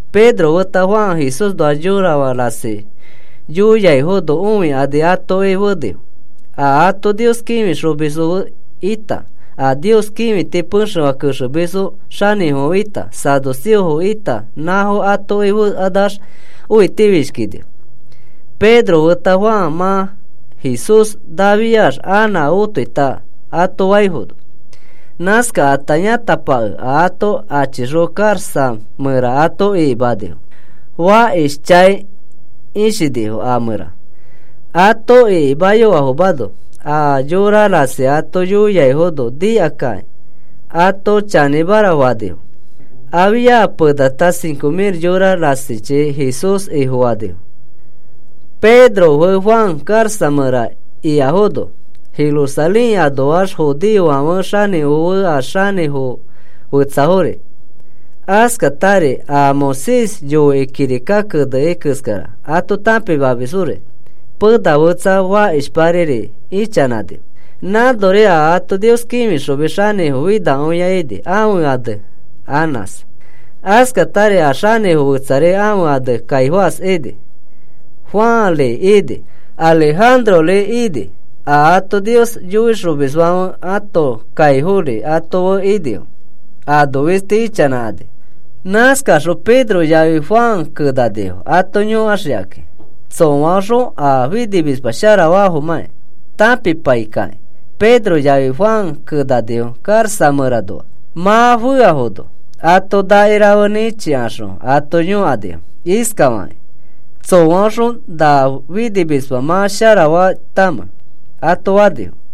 Pedro feta Juan Jesúsnoa yorafã rasi yoiaifono õikani atoki fenifo, a ato Nios kĩfixomisfo ita, a Nios kĩfiti pexefã kexemisfo xanĩfofo ita, saduceofo ita nãfo atoki fekanax õitifishkinifo, Pedro feta Juan mã Jesús nafiax anã otoita ato faifono. Nãskakata yãtapakẽ ato achixõ karaxa mẽra ato ikimanifo. Fakishchãi ishinifo a mẽra. Ato ikimayofafomano a yora rasi ato yoiaifono nikakakĩ ato chanĩmara fakõinifo. Afia penata cinco mil yora rasichi Jesús Ifofanifo. Pedro fe Juan karaxa mẽra ikafono, Jerusalén anoax judeofãfe xanĩfofo fe a xanĩfo fetsafori, askatari a Moisés yoikĩ kirika keneni keskara ato tãpimamisfori pena fetsa fakishpari ichanãnifo. Nãnori a ato Nios kĩfixomis xanĩfo finakõia ini ãfe ane Anás. Askatari a xanĩfo fetsari ãfe ane Caifás ini, Juanri ini, Alejandrori ini, a ato Nios yoixomisfãfe ãto kaifori ato fe inifo, ano fisti ichanãkani. Nãskaxõ Pedro yafi Juan kenanifo ato yõkaxikakĩ. Tsõaõxõ a finimisma sharafafomãki tãpipai kakĩ Pedro yafi Juan kenanifo karaxa mẽranoa. Mã feafono ato nakirafe nĩchikaxõ ato yõkanifo iskafakakĩ: “¿Tsõaõxõ na finimisma mã sharafaitamẽ?” ato fanifo.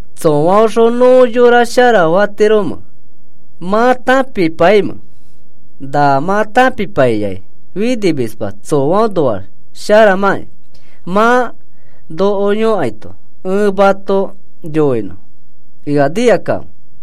¿Tsõaõxõ nõ yora sharafatiromẽ mã tãpipaimẽ? Na mã tãpipaiyai finimisma tsõaõnoax sharamãkĩ mã noko yõkaito ẽ mato yoinõ. Ea nikakãfe.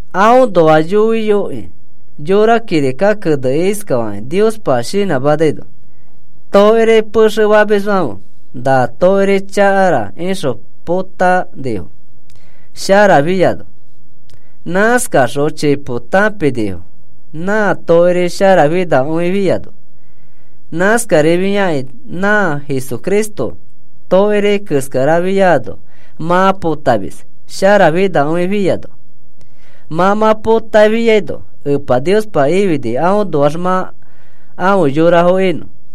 “Aõnoa yoiyokĩ yõra kirika keneni iskafakĩ Niospa shinãmanaino: Tokiri pexe famisfãfe, ‘Na tokiri chakara,’ ixõ potanifo sharafiano. Nãskakaxõ chipo tãpinifo nã tokiri sharafinakõifiano. Nãskarifakĩ nã Jesucristo tokiri keskarafiano mã potamis sharafinakõifiano. Mã mã potafiano Epa Niospa ifini aõnoax mã afe yorafo inõ.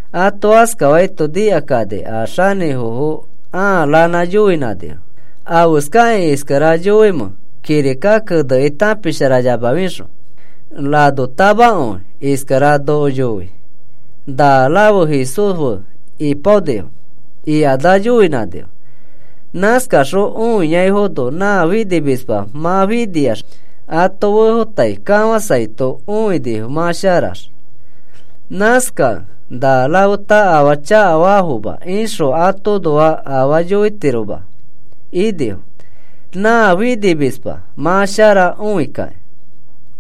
Ato askafaito nikakani a xanĩfofo ãa ranã yoinãnifo: “¿Afeskakĩ iskara yoimẽ kirika kenekĩ tãpisharayamafixõ? Ranotamakõi iskara noko yoi. ‘Na rafe Jesús fe ipaonifo,’” ikanax yoinãnifo. Nãskaxõ õiaifono nã finimisma mã finiax ato fefotai kafãsaito õinifo mã sharax. Nãskakẽ na rafeta afaa chakafafoma ixõ atoõnoa afaa yoitiroma inifo nã finimisma mã shara õikakĩ.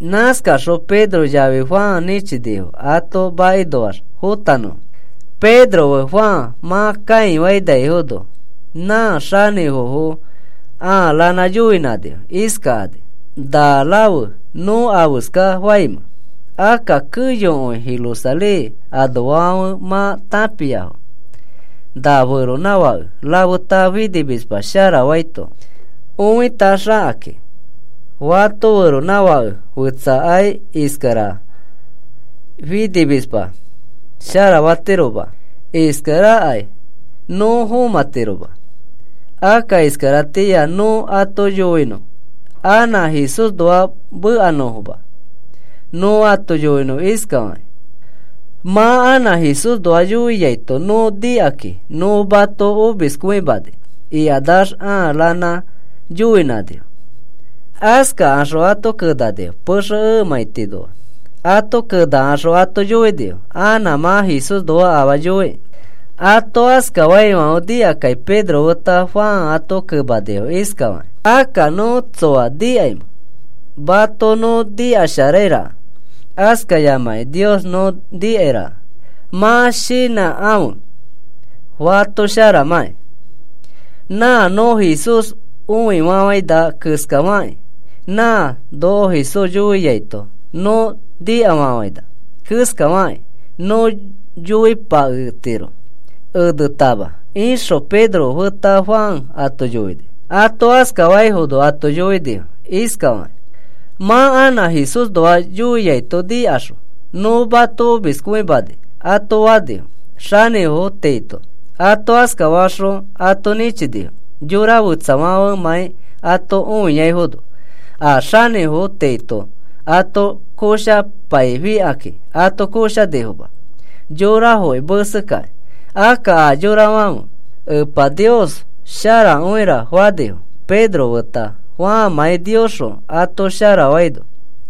Nãskakaxõ Pedro yafi Juan nĩchinifo ato makinoax fotanõfo. Pedro fe Juan mã kãifainaifono, nã xanĩfofo ãa ranã yoinãnifo iskakani: “¿Na rafe nõ afeska faimẽ? Akka keyokõi Jerusalén anoafãfe mã tãpiafo, na feronãfake rafeta finimisma sharafaito õitaxakakĩ. Fato feronãfake fẽtsakai iskara finimisma sharafatiroma. Iskarakai nõ fomãtiroma. Akka iskaratĩa nõ ato yoinõ anã Jesúsnoax mekanõfoma. Nõ ato yoinõ iskafakĩ: ‘Mã anã Jesúsnoa yoiaito nõ nikakĩ nõ mato omiskõimani,’” ikanax ãa ranã yoinãnifo. Askaxõ ato kenanifo pexe emãitinoa. Ato kenakaxõ ato yoinifo: “Anã mã Jesúsnoa afaa yoikĩ.” Ato askafaifãfe nikakĩ Pedro feta Juan ato kemani iskafakakĩ: “¿Akka nõ tsoa nikaimẽ? Mato nõ nikasharairaka, askayamakĩ Nios nõ nikairaka. Mã shinãkãfe fato sharamãkĩ. Nã nõ Jesús õifafaina keskafakĩ, nã noko Jesús yoiaito nõ nikafafaina keskafakĩ nõ yoipaketiro enetama,” ixõ Pedro feta Juan ato yoini. Ato askafaifono ato yoinifo iskafakakĩ: “Mã anã Jesúsnoa yoiaito nikaxõ nõ mato omiskõimani,” ato fanifo xanĩfo tiito. Ato askafakaxõ ato nĩchinifo yora fetsafãfemãi ato õiaifono. A xanĩfo tiito ato koshapaifikakĩ ato koshanifoma yorafoki mesekakĩ. Akka a yorafãfe, “Epa Nios sharakõira,” fanifo Pedro feta Juanmãi Niosxõ ato sharafaino.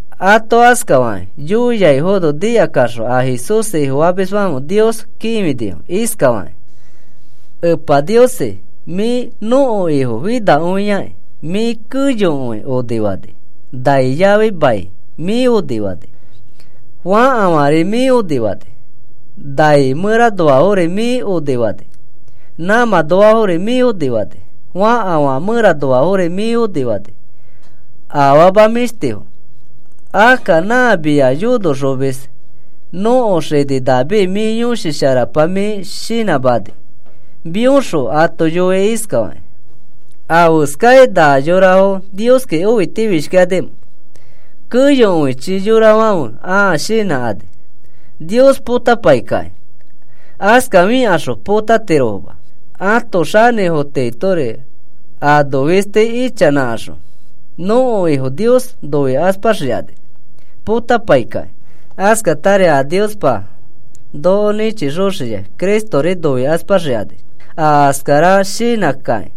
Ato askafakĩ yoiaifono nikakaxõ a Jesús Ifofamisfãfe Nios kĩfinifo iskafakakĩ: “Epa Niosi, mĩ nõko Ifo finakõiaki. Mĩ keyokõi onifani. Nai yafi mai mĩ onifani. Fãkafãri mĩ onifani. Nai mẽranoari mĩ onifani. Nãmãnoafori mĩ onifani, fãkafã mẽranoafori mĩ onifani, afama mĩshtifo. Akka nã mia yonoxomis nõko xini David mĩ Yõshi Sharapa mĩ shinãmani mĩõxõ ato yoini iskafakĩ: ¿Afeskai na yorafo Nioski õitifishkikanimẽ? Keyokõichi yorafãfe ãa shinãkani Nios potapaikakĩ. Askafikaxõ potatirofoma. Ãto xanĩfo tiitori ano fisti ichanãkaxõ nõko Ifo Nios noikaspaxikani potapaikakĩ. Askatari a Niospa noko nĩchixoxiai Cristori noikaspaxikani. Aa askara shinãkakĩ,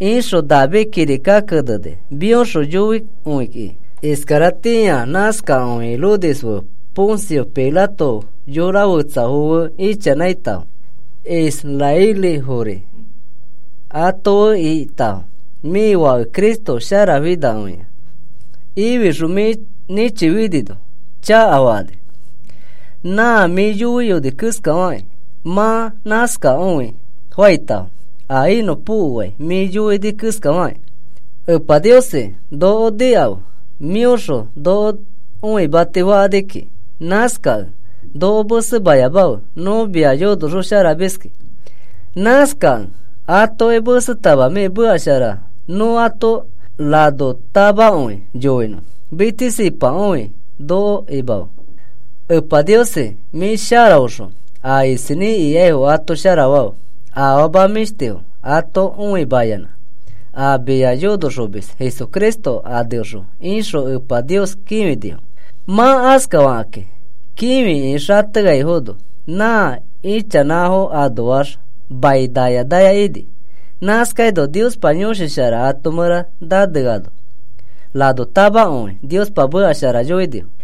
ixõ David kirika keneni mĩõxõ yoikõikĩ. “Iskaratĩa nãskakõi Herodes fe Poncio Pilato yorafetsafo fe ichanãitafo, israelifori ato fe ikitafo mĩ Fake Cristo Sharafinakõia ifixõ mĩ nĩchifinino chakafakani. Nã mĩ yoiyoni keskafakĩ mã nãskakõi faitafo a inõpokoai mĩ yoini keskafakĩ. Epa Niosi, noko nikãfe mĩoxõ noko noimati fakani kiki. Nãskakẽ noko mesemayamafe nõ mia yonoxosharamiskĩ. Nãskakẽ atoki mesetama mĩ meka shara nõ ato ranotamakõi yoinõ mitsisipakõi noko imafe. Epa Niosi, mĩ sharaõxõ a isinĩ ikaifo ato sharafafe, afama mĩshtifo ato õimayanã a mia yonoxomis Jesucristo aneõxõ,” ixõ Epa Nios kĩfinifo. Mã askafakakĩ kĩfikĩ xateaifono nã ichanãfo anoax mai naya naya ini. Nãskaino Niospa Yõshi Shara ãto mẽra naneaino ranotamakõi Niospa meka shara yoinifo.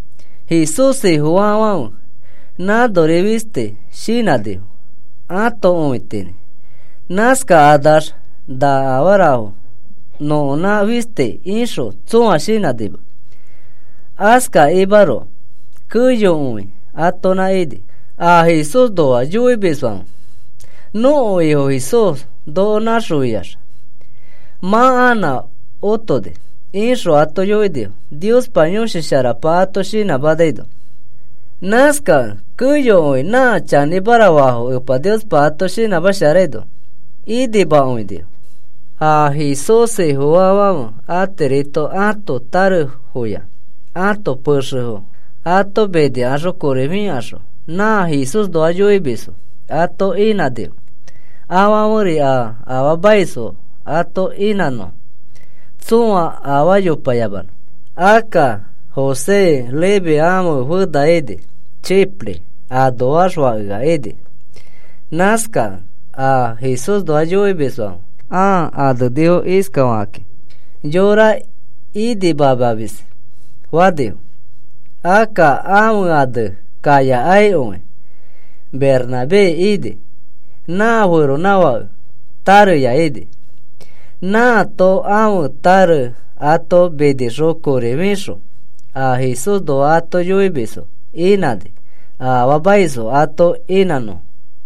Jesús Ifofaafãfe nãnori fistis shinãnifo ãto õitinĩ. Nãskakanax na afarafo nõkonã fistis ixõ tsõa shinãnima. Askakimaroko keyokõi atonã ini. A Jesúsnoa yoimisfãfe, “Nõko Ifo Jesús noko nãxofiax mã anã otoni,” ixõ ato yoinifo Niospa Yõshi Sharapa ato shinãmanaino. Nãskakẽ keyokõi nã chanĩmara faafo Epa Niospa ato shinãmasharaino inimakõinifo. A Jesús Ifofaafãfe atirito ãto tarefoya ãto pexefo ato minikaxõ kori fikaxõ nã Jesúsnoa yoimisfo ato inãnifo afãferi a afaamaisfo ato inãnõfo tsõa afaa yopayamanõ. Akka José Leví ãfe fena ini. Chipre anoax fakea ini. Nãskakẽ a Jesúsnoa yoimisfãfe ãa anenifo iskafakakĩ: “Yora Inimamamis” fanifo. Akka ãfe ane kaiyakõi Bernabé ini. Nã feronãfake tareya ini. Nãato ãfe tare ato minixõ kori fixõ a Jesúsnoa ato yoimisfo inãni a afaamaisfo ato inãnõfo.